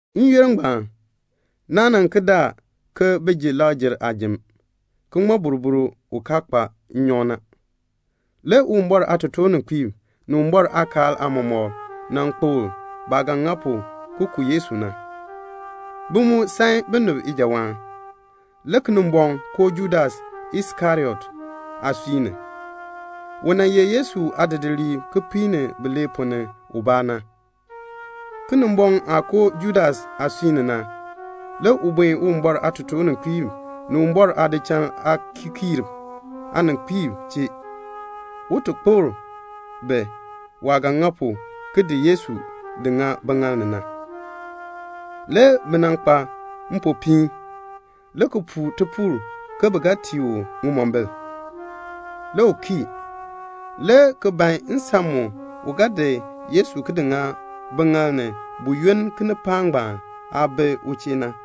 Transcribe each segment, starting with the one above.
N-yoonn ngbaan, naan yunn le bi ga ji Lakr-jer aajim, ki ŋmɔ boroboro u kaa kpa nnyɔk na. Le Uwumbɔr aatotoorninkpiib ni Uwumbɔr aakaal aamɔmɔkb nan kpokl baah ga ŋa pu ki ku Yesu na. Bi mu san binib ijawaan la. Le Kinimbɔŋ koo Judas Iskariot aasui ni. U ye Yesu aadidiliib kipiik ni bilee ponn ni ubaa. Kinimbɔŋ aah koo Judas aasui ni na, le u buen Uwumbɔr aatotoorninkpiib ni Uwumbɔr aadichal aakikiirb aaninkpiib chee, un ti kpokl bi waah ga ŋa pu ki di Yesu di ŋa biŋaal ni na. Le bi kpa mpopiin, le ki puu tipuul ke bi ga tii u ŋimombil la. Le u kii, le ki ban nsan mu u ga di Yesu ki di ŋa biŋaal ni buyoonn kinipaak ngbaan aah kaa bi u chee na.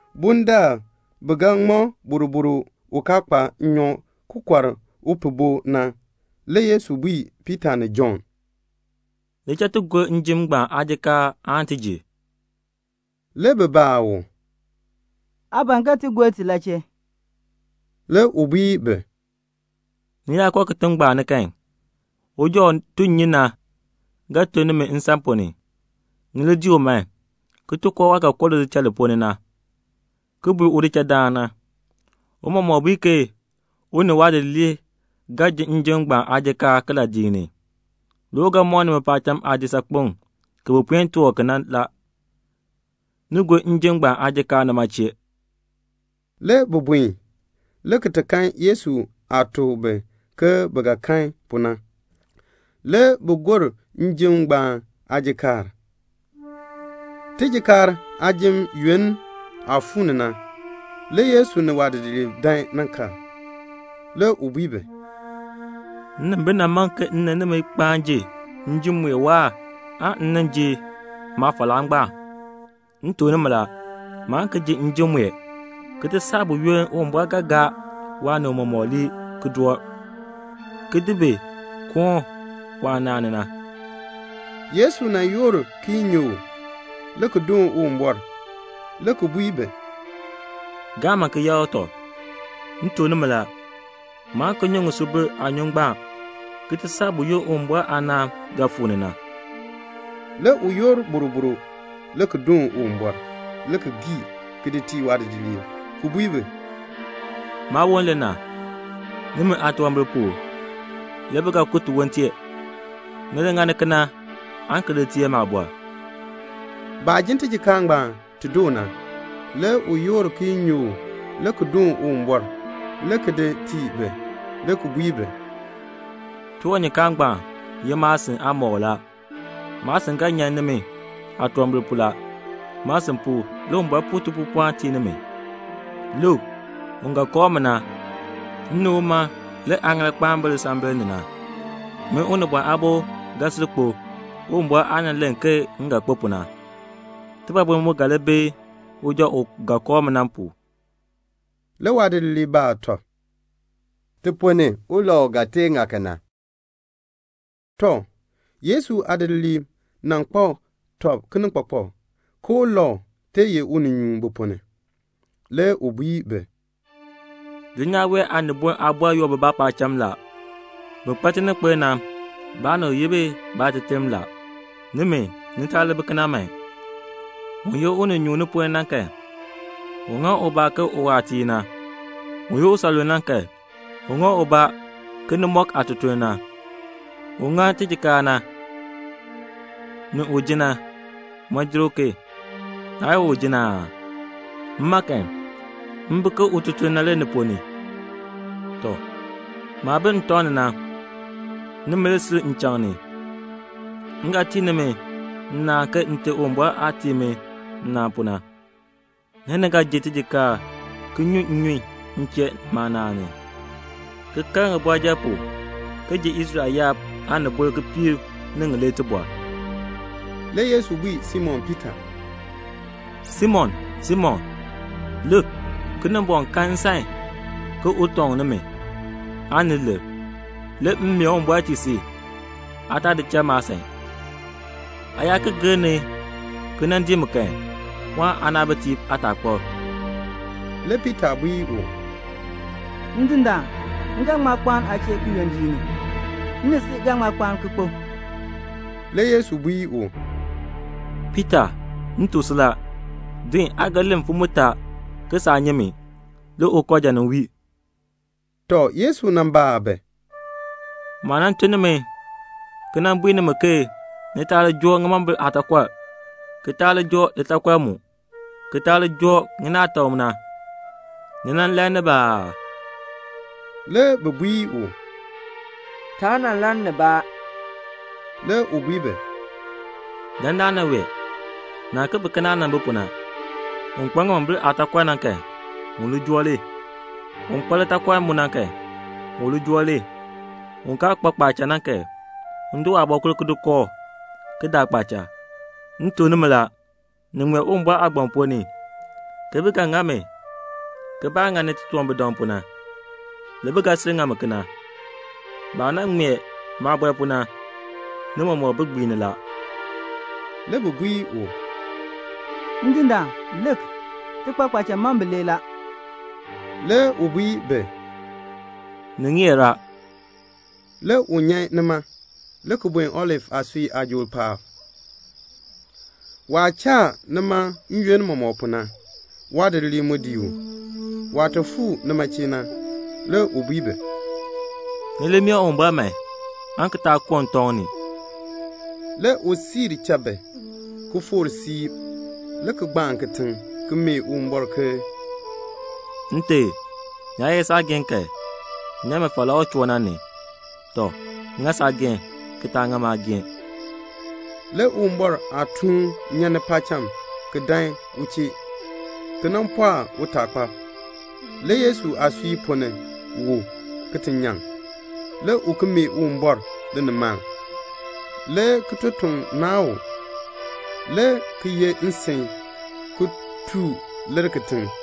Bundaln bi ŋmɔ boroboro u kaa kpa nnyɔk na ki kɔr upihbo na, le Yesu bui Piita ni Jɔnn, "Li cha ti gor njim ngbaan aajikaar aan ti ji." Le bi baa u, "Aa ban ke ti gor ti la chee?" Le u bui bi, "Ni yaa koo kitiŋ ngbaan ni kan, uja u tun nnyun na ga ton nimi nsan ponn ni. Ni li dii u man, ki koo waah ga koo lidichal li ponn ni na, ki bui udichaldaan na, 'Tiicha bui ke u ni waadidiliib ga ji njim ngbaan aajikaar kiladiik ni?' Le u ga mɔk nimi paacham aadisaakpeŋ ki bi puen toor ki na la. Ni li gor njim ngbaan aajikaar nima chee." Le bi buen, le ki kan Yesu aah tuk bi ke bi ga kan pu na. Le bi gor njim ngbaan aajikaar. Tijikaar aajim yoonn aah fuu ni na, le Yesu ni waadidiliib dan nan kal. Le u bui bi, "Nnimbil nan man ke m ni nimi kpaan ji njim mue waahr aan m nin ji maafalaa ngbaan. M tuk nimi la, maan ki ji njim mue ki ti saa buyoonn Uwumbɔr ga gaa waanib mɔmɔk lii ki doo, ki di bi koon waanaan ni na." Le Yesu yoor kiyinyook, le ki doon Uwumbɔr, le ki bui bi, "Gaa man ki yakr tɔb. M tuk nimi la, maan ki nyu ŋisubil aanyun ngbaan ki ti saa buyoonn Uwumbɔr aanaan ga fuu ni na." Le u yoor boroboro, le ki doon Uwumbɔr, le ki gii, ki di tii waadidiliib le ki bui bi, "Maawon le na. Nimi aatunwambir pu le bi ga ku tiwon tee. Ni li ŋani kena aan ki li teer maabɔr." Baah jin tijikaar ngbaan ti doo na, le u yoor kiyinyook le ki doon Uwumbɔr, le ki di tii bi, le ki bui bi, "Tiwanyukaan ngbaan ye maasin aamɔkl la. Maasin ga nyan nimi aatunwambir pu. Maasin pu, le Uwumbɔr puu tipuupɔln ki tii nimi. "Lik, un ga kooh mi na, m ni uma le aaŋaal kpaan ki bi teebl paab. Min Unibɔn Aabo ga sil kpo, Uwumbɔr aah nan len ke m ga kpo pu na. Tibɔbil mu ga li bi uja u ga kooh mi na pu." Le waadidiliib baa tɔb, "Ti ponn ni, ulau ga tee ŋa kena?" Tɔ, le Yesu aadidiliib kpak tɔb kinikpakpak ke ulau tee ye uninyuun bi ponn ni. Le u bui bi, "Dulnyaa wee aaniboln aabɔrb yoor bibaa paacham la. Bin kpa tininkpil na, baanib yi bi baateterm la. Nimi, ni taa li bi kena man. Un ye uninyuun ni ponn ni na kan, un ŋa ubaa ke uwaatiir na. Un ye usanluln na kan, un ŋa ubaa ke nimɔk aatutuln na. Un ŋa tijikaar na, ni un ji na, ŋmaa jer uken? Naa ye un ji na aa? Mma kan, m bi ke ututuln na ni ponn ni. "Tɔ, maah bi ntɔŋ ni na, nimi le sil nchaŋ ni. M ga tii nimi nnaan ke Nte Uwumbɔr aah tii mi nnaan pu na. Le ni ga ji tijikaar ki nyu nnyun m chee maanaan ni, ki kal ŋibɔrjal pu, ki ji Israel yaab aanibol kipiik ni ŋilee tibɔr." Le Yesu bui Simon Piita, "Simon, Simon, lik, Kinimbɔŋ kan nsan ke un tɔŋ nimi, ni lir. Le m mee Uwumbɔr tii si aa taa di cha maasan. Aa yaa ki gir ni ki dii mi kan, pɔɔn aanaabitiib aataakpab." Le Piita bui u, "Ndindaan, m ga ŋma kpaan aa chee kiyondiik ni. M ni si ga ŋma kpaan ki kpo." Le Yesu bui u, "Piita, m tuk si la, din, aa ga len mfim mutaa ke saa nyi mi, le ukooja nin wii." Tɔ, le Yesu baa bi, "Maah nan tun nimi na, ki nan bui nimi ke ni taa li joo ŋimombil aataakɔr, ki taa li joo litaakɔr mu, ki taa li joo ŋinaatak na, ni nan lann nibaa aa?" Le bi bui u, "Taa nan lann nibaa." Le u bui bi, "Dandana wee, naa ki bi ke naah nan bi pu na. Un kpa ŋimombil aataakɔr na kan, u li joo li. Un kpa litaakɔr mu na kan, u li joo li. Un kaa kpa kpaacha na kan, un di waabɔkul ki di kooh, ki daa kpaacha. M tuk nimi la, ni ŋmee Uwumbɔr aagbaŋ ponn ni, ke bi ga ŋa mi ke baah ŋani titunwambirdam pu na. Le bi ga sil ŋa mi kena. Baah nan ŋmee maabɔr pu na, ni mɔmɔk bi gbiini la." Le bi bui u, "Ndindaan, lik, ti kpa kpaacha mam bilee la." Le u bui bi, "Ni ŋeer la." Le u nyan nima, le ki buen Olif aasui aajool paab, waah cha nima n-yoonn mɔmɔk pu na. Waadidiliib mu dii u. Waah fuu nima na, le u bui bi, "Ni li mee Uwumbɔr man, aan ki taa koo ntɔŋ ni." Le u cha bi, ki foor siib, le ki gbaan kitiŋ ki mee Uwumbɔr ke "Nte, ni yaa ye saageehn kan, nyan mi falaa u choo na ni. Tɔ, ŋa saageehn, ki taa ŋa maageehn." Le Uwumbɔr aatuun nyan paacham ki dan u chee ki pɔɔk utaakpab. Le Yesu aasui ponn ni wu ki ti nyaŋ. Le u ki mee Uwumbɔr linimaln. Le kitotoŋ naan u, le ki ye nsin ki tuu lir kitiŋ.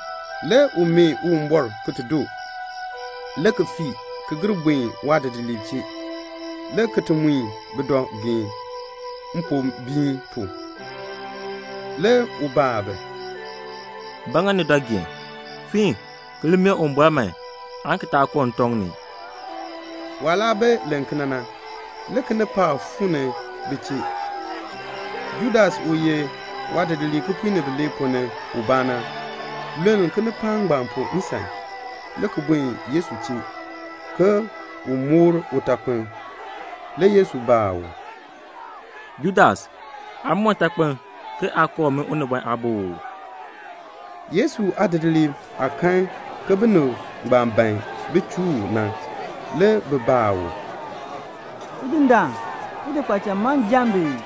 Le u mee Uwumbɔr doo, le ki fii, ki gir buen waadidiliib chee, le ki ti mui bi dɔ geen mpombiin pu. Le u baa bi, "Ba ŋa ni dɔ geen? Fiin, aan ki li mee Uwumbɔr man, aan ki taa koo ntɔŋ ni." Waah laa bi len kena na, le kinipaak fuu ni bi chee. Judas u ye waadidiliib kipiik ni bilee ponn ni ubaa na, luln kinipaak ngbaan pu nsan, le ki duun Yesu, ke un ti moor utakpiln. Le Yesu baa u, "Judas, aa moor ntakpiln ke aa kooh min Unibɔn Aabo oo?" Yesu aadidiliib aah kan ke binib ngbaan ban bin chuu u na, le bi baa u, "Tidindaan, ti di kpaacha mam ki jaa bi ii?"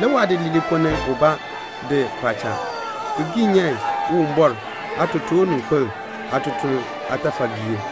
Le waadidiliib ponn ni ubaa di kpaacha ki gii nyan Uwumbɔr aatotoorninkpil aatutuln aatafalgiir.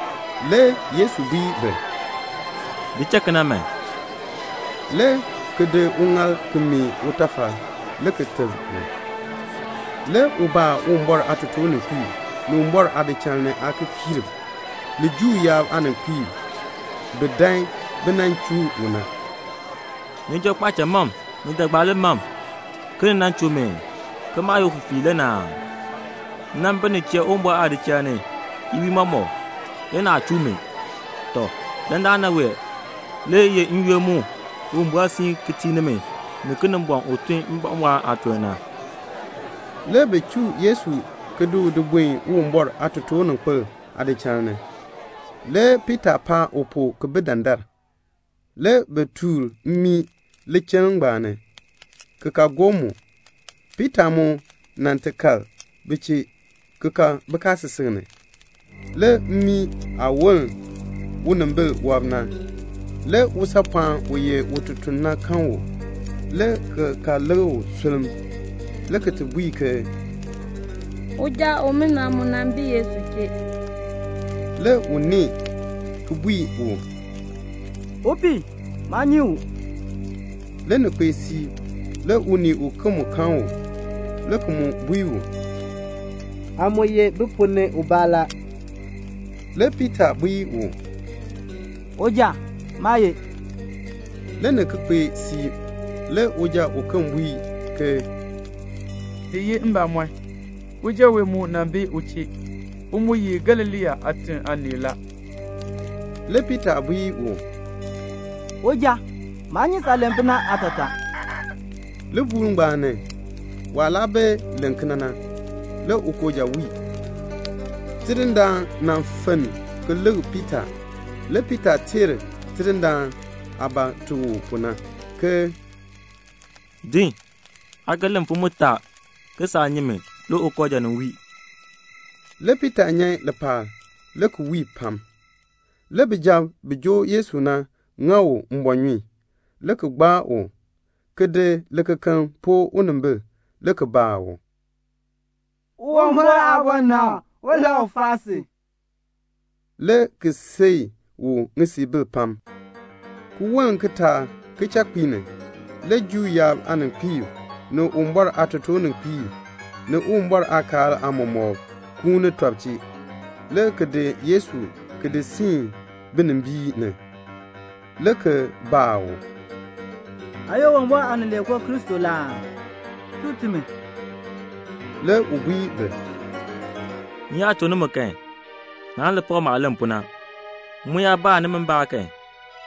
Le Yesu bui bi, "Di cha kena man," le ki di uŋaal ki meeh utafal le ki teb u. Le u baa Uwumbɔr aatotoorninkpiib, ni Uwumbɔr aadichal ni aakikiirb, ni Juu yaab aaninkpiib bi dan bi nan chuu u na, "Ni joo kpaacha mam ni jagbaali mam, ke ni nan chuu mi, ke maah ye ufifiir le na aa? M nan bi ni chee Uwumbɔr aadichal ni iwiin mɔmɔk, le naa nan chuu mi. Tɔ, dandana wee le ye n-yoonn mu Uwumbɔr siin ki tii nimi ni Kinimbɔŋ u tun mbɔmbɔɔn aatuln na." Le bi chuu Yesu ki di u di buen Uwumbɔr aatotoorninkpil aadichal ni. Le Piita paan u pu ki bi dandar. Le bi tuur mmii lichiln ngbaan ni, le ki ka gob mu. Piita mu kpaan bi chee ki kal bikaasisik ni. Le mmii aah woln unimbil wɔb na, le usaapɔɔn ututuln na kan u, le ki kal lik u sulm, le ki bui ke, "Uja umina mu nan bi Yesu chee." Le u nee, le ki bui u, "Upii, maa nyi u." Le ni kpee siib, le unii uken mu kan u, le ki bui u, "Aa mu ye bi ponn ni ubaa la." Le Piita bui u, "Uja, maa ye." Le ni ki kpee siib, le uja uken bui ke "Ni ye mbamɔn, uja wee mu nan bi u chee. U mu ye Galilee aatiŋ aanii la." Le Piita bui u, "Uja, maa nyi saah len pu na aatataa." Libuul ngbaan ni, waah laa bi len kena na, le ukooja wii. Le Tidindaan fenn ki lik Piita. Le Piita teer Tidindaan aah tuk u pu na, "Din, aa ga len mfim mutaa ke saa nyi mi le ukooja nin wii." Le Piita nyan lipaal, le ki wii pam. Le bijab bi joo Yesu na, bi ŋa u mbɔɔnyun, le ki gbaa u, le ki di likekeln ki poo unimbil, le ki baa u, "Uwumbɔr aabɔnabr, ulau faa si?" le ki sii u ŋisiibil pam. Ki woln kitaak kichakpiik ni, le Juu yaab aaninkpiib, ni Uwumbɔr aatotoorninkpiib, ni Uwumbɔr aakaal aamɔmɔkb, kuun tɔb chee, le ki di Yesu ki di siin binimbiin ni, le ki baa u, "Aa ye Uwumbɔr Aanileekoo Kristo la aa? Tuk timi." Le u bui bi, "M yaa tuk nimi kan, naan li pak maah len pu na. M mu yaa baa nimi mbaan kan,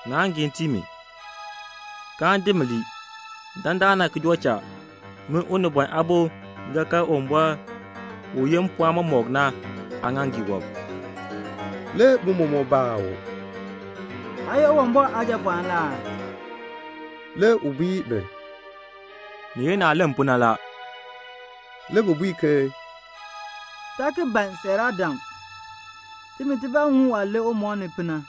naan giin tii mi, [kaan di mi lii.] Dandana ki joo cha, min Unibɔn Aabo ga kal Uwumbɔr u yeh mpɔɔn mɔmɔk na aaŋaaŋgii wɔb." Le bi mɔmɔk baa u, "Aa ye Uwumbɔr Aajapɔɔn la aa?" Le u bui bi, "Ni ye naah len pu na la." Le bi bui ke, "Taa ki ban siiraadam. Timi tibaa ŋun waah len umɔb ni pu na."